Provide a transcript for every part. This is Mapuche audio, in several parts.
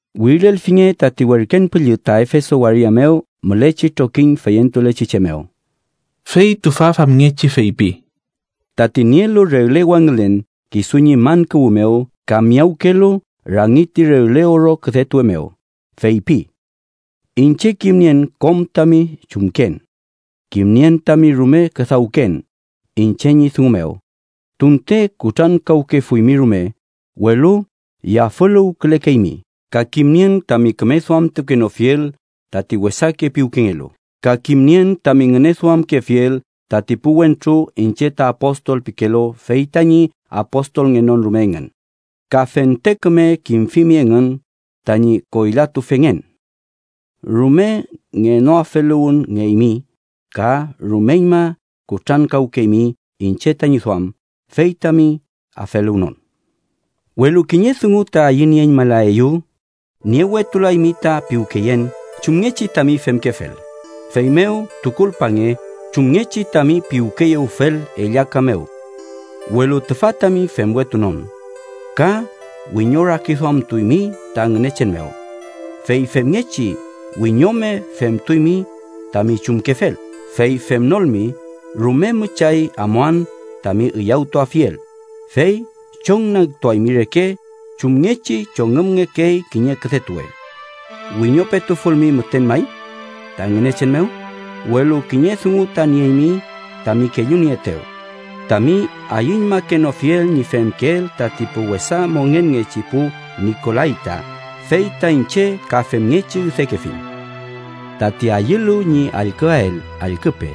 “Wirilelfinge tati werken püllü ta Efeso waria mew mülechi trokiñ feyentulechi che mew. Fey tüfa famngechi feypi: Tati nielu regle wangülen kisu ñi man kuwü mew ka miyawkelu rangi ti regle oro küdetuwe mew, feypi: Iñche kimnien kom tami chumken. Kimnien tami rume küdawken iñche ñi dungu mew tunte kutrankawkefuymi rume, welu yafüluwkülekeymi. Ka kimnien tami küme duamtukenofiel tati wesake piwkengelu. Ka kimnien tami ngüneduamkefiel tati pu wentru iñche ta apostol pikelu fey tañi apostolngenon rume engün, ka fente küme kimfimi engün tañi koylatufengen. Rume ngenoafeluwünngeymi, ka rumeñma kutrankawkeymi iñche tañi duam, fey tami afeluwnon. Welu kiñe dungu ta ayünieñmalayaeyu: niewetulaymi ta piwkeyen chumngechi tami femkefel. Feymew, tukulpange chumngechi tami piwkeyewfel ellaka mew, welu tüfa tami femwetunon, ka wiñorakiduamtuymi ta Ngünechen mew, fey femngechi wiñome femtuymi tami chumkefel. Fey femnolmi, rume müchay amuan tami üyawtuafiel fey chongnagtuaymi reke chumngechi chongümngekey kiñe küdetuwe, wiñopetufulmi müten may ta Ngünechen mew. Welu kiñe dungu ta nieymi tami kellunieetew: tami ayüñmakenofiel ñi femkeel tati pu wesa mongenngechi pu nikolayta, fey ta iñche ka femngechi üdekefiñ. ¡Tati ayülu ñi allküael, allküpe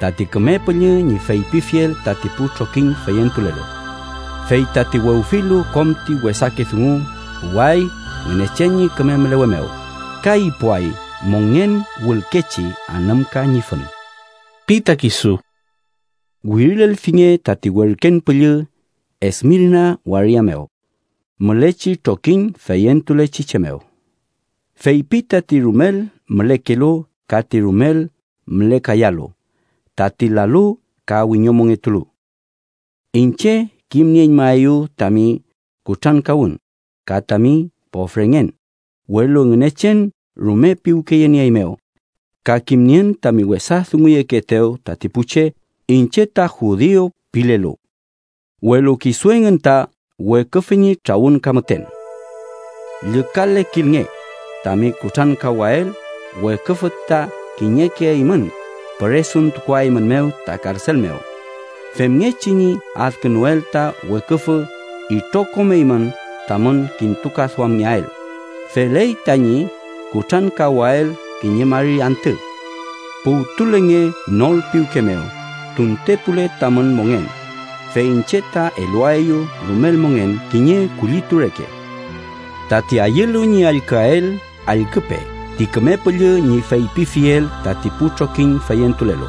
tati Küme Püllü ñi feypifiel tati pu trokiñ feyentulelu! Fey tati wewfilu kom ti wesake dungu puway Ngünechen ñi küme mülewe mew, ka ipuay mongen wülkechi anümka ñi fün ―pi ta kisu. “Wirilelfinge tati werken püllü Esmirna waria mew mülechi trokiñ feyentulechi che mew: Feypi tati rumel mülekelu ka ti rumel mülekayalu, tati lalu ka wiñomongetulu: Iñche kimnieñmaeyu tami kutrankawün ka tami pofrengen, welu Ngünechen rume piwkeyenieeymew. Ka kimnien tami wesa dunguyekeetew tati pu che iñche ta judiu pilelu, welu kisu engün ta Weküfü ñi trawün ka müten. Llükalekilnge tami kutrankawael, weküfü ta kiñeke eymün püresuntukuaeymew ta karsel mew, femngechi ñi adkünuel ta weküfü itrokom eymün tamün kintukaduamngeael. Feley tañi kutrankawael kiñe mari antü. Puwtulenge nor piwke mew tuntepule tamün mongen, fey iñche ta eluaeyu rumel mongen kiñe kullitu reke. ¡Tati ayülu ñi allküael, allküpe ti Küme Püllü ñi feypifiel tati pu trokiñ feyentulelu!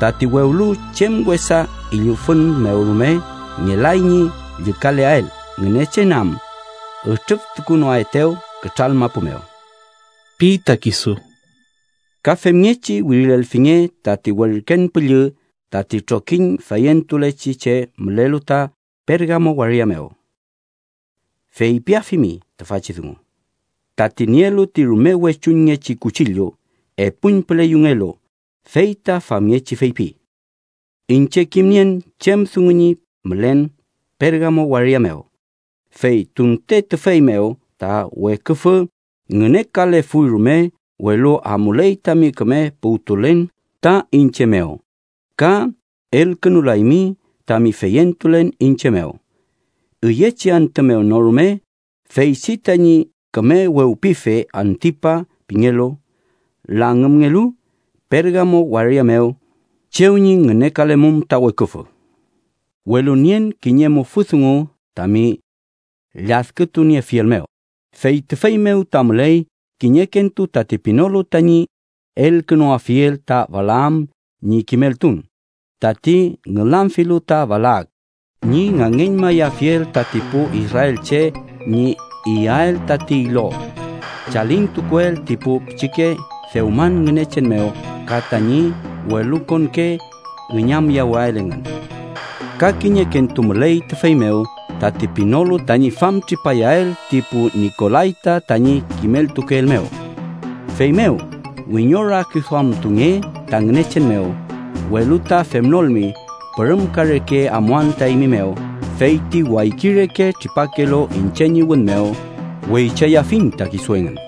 Tati wewlu chem wesa üllüfün mew rume, ngelay ñi llükaleael, Ngünechen am ütrüftukunoaetew kütral mapu mew ―pi ta kisu. “Ka femngechi wirilelfinge tati werken püllü tati trokiñ feyentulechi che, mülelu ta Pergamo waria mew. Feypiafimi tüfachi dungu: Tati nielu ti rume wechungechi kuchillu, epuñpüle yungelu, fey ta famngechi feypi: Iñche kimnien chem dungu ñi mülen Pergamo waria mew, fey tunte tüfey mew ta weküfü ngünekalefuy rume, welu amuley tami küme puwtulen ta iñche mew ka elkünulaymi tami feyentulen iñche mew, üyechi antü mew no rume feychi tañi küme wewpife, Antipa pingelu, langümngelu Pergamo waria mew chew ñi ngünekalemum ta weküfü. Welu nien kiñe mufü dungu tami lladkütuniefiel mew: fey tüfey mew ta müley kiñekentu tati pinolu tañi elkünuafiel ta Balaam ñi kimeltun, tati ngülamfilu ta Balak ñi ngangeñmayafiel tati pu israelche ñi iyael tati ilo chalintukuel ti pu pichike dewman ngünechen mew ka tañi welukonke üñamyewael engün. Ka kiñekentu müley tüfey mew tati pinolu tañi famtripayael ti pu nikolayta tañi kimeltukeel mew. Feymew wiñorakiduamtunge ta Ngünechen mew; welu ta femnolmi, pürümka reke amuan ta eymi mew, fey ti wayki reke tripakelu iñche ñi wün mew weychayafiñ ta kisu engün.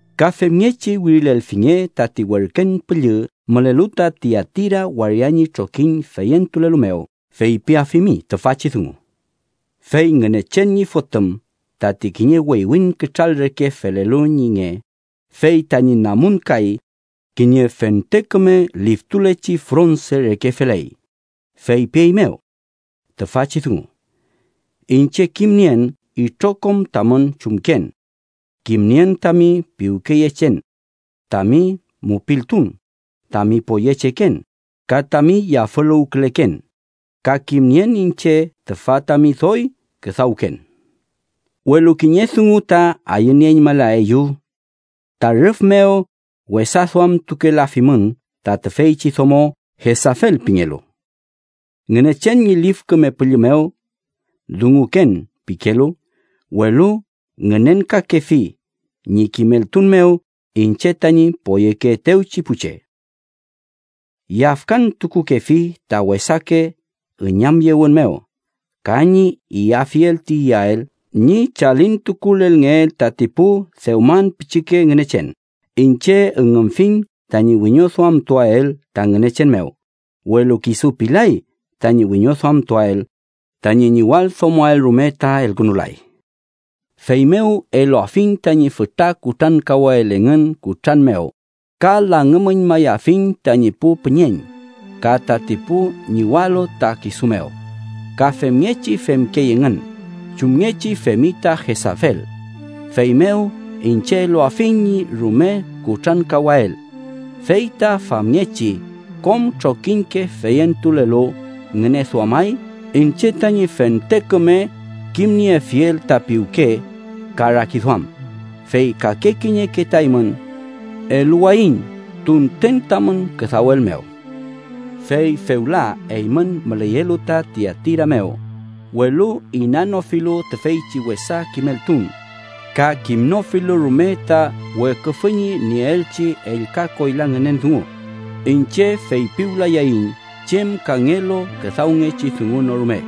“Ka femngechi wirilelfinge tati werken püllü mülelu ta Tiatira waria ñi trokiñ feyentulelu mew. Feypiafimi tüfachi dungu: Fey Ngünechen ñi Fotüm, tati kiñe weywiñ kütral reke felelu ñi nge, fey tañi namun kay kiñe fente küme liftulechi fronse reke feley, feypieymew tüfachi dungu: Iñche kimnien itrokom tamün chumken. Kimnien tami piwkeyechen, tami mupiltun, tami poyecheken ka tami yafüluwküleken, ka kimnien iñche tüfa tami doy küdawken. Welu kiñe dungu ta ayünieñmalayaeyu: ta rüf mew wesa duamtukukelafimün ta tüfeychi domo Jesafel pingelu. Ngünechen ñi Lif Küme Püllü mew dunguken pikelu, welu ngünenkakefi ñi kimeltun mew iñche tañi poyekeetewchi pu che. Yafkantukukefi ta wesake üñamyewün mew ka ñi iyafiel ti iyael ñi chalintukulelngeel tati pu dewman pichike ngünechen. Iñche üngümfiñ tañi wiñoduamtuael ta Ngünechen mew; welu kisu pilay tañi wiñoduamtuael, tañi ñiwaldomoael rume ta elkünulay. Feymew, eluafiñ tañi fütra kutrankawael engün kutran mew ka langümüñmayafiñ tañi pu püñeñ. Ka tati pu ñiwalu ta kisu mew, ka femngechi femkey engün chumngechi femi ta Jesafel, feymew iñche eluafiñ ñi rume kutrankawael. Fey ta famngechi kom trokiñke feyentulelu ngüneduamay iñche tañi fente küme kimniefiel ta piwke ka rakiduam. Fey kake kiñeke ta eymün eluwayiñ tunten tamün küdawel mew. Fey fewla eymün müleyelu ta Tiatira mew, welu inanofilu tüfeychi wesa kimeltun ka kimnofilu rume ta Weküfü ñi nieelchi ellka koyla ngünen dungu, iñche feypiwlayayiñ chem kangelu küdawngechi dungu no rume.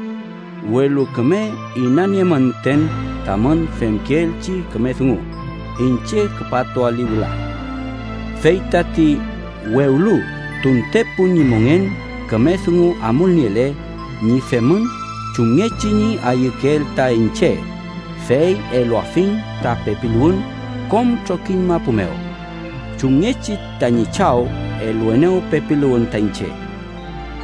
Welu küme inaniemün müten tamün femkeelchi küme dungu, iñche küpatuali wüla. Fey tati wewlu tuntepun ñi mongen küme dungu amulniele ñi femün chumngechi ñi ayükeel ta iñche, fey eluafiñ ta pepiluwün kom trokiñ mapu mew, chumngechi tañi Chaw eluenew pepiluwün ta iñche.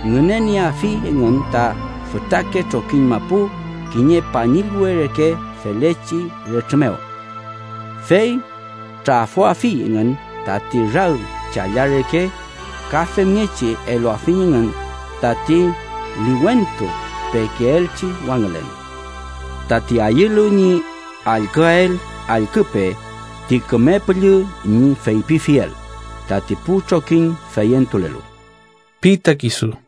i Ngünenieafi engün ta fütrake trokiñ mapu kiñe pañillwe reke felechi retrü mew, i fey trafoafi engün tati rag challa reke. Ka femngechi eluafiñ engün tati liwentu pekeelchi wangülen. ¡Tati ayülu ñi allküael, allküpe ti Küme Püllü ñi feypifiel tati pu trokiñ feyentulelu! ―pi ta kisu.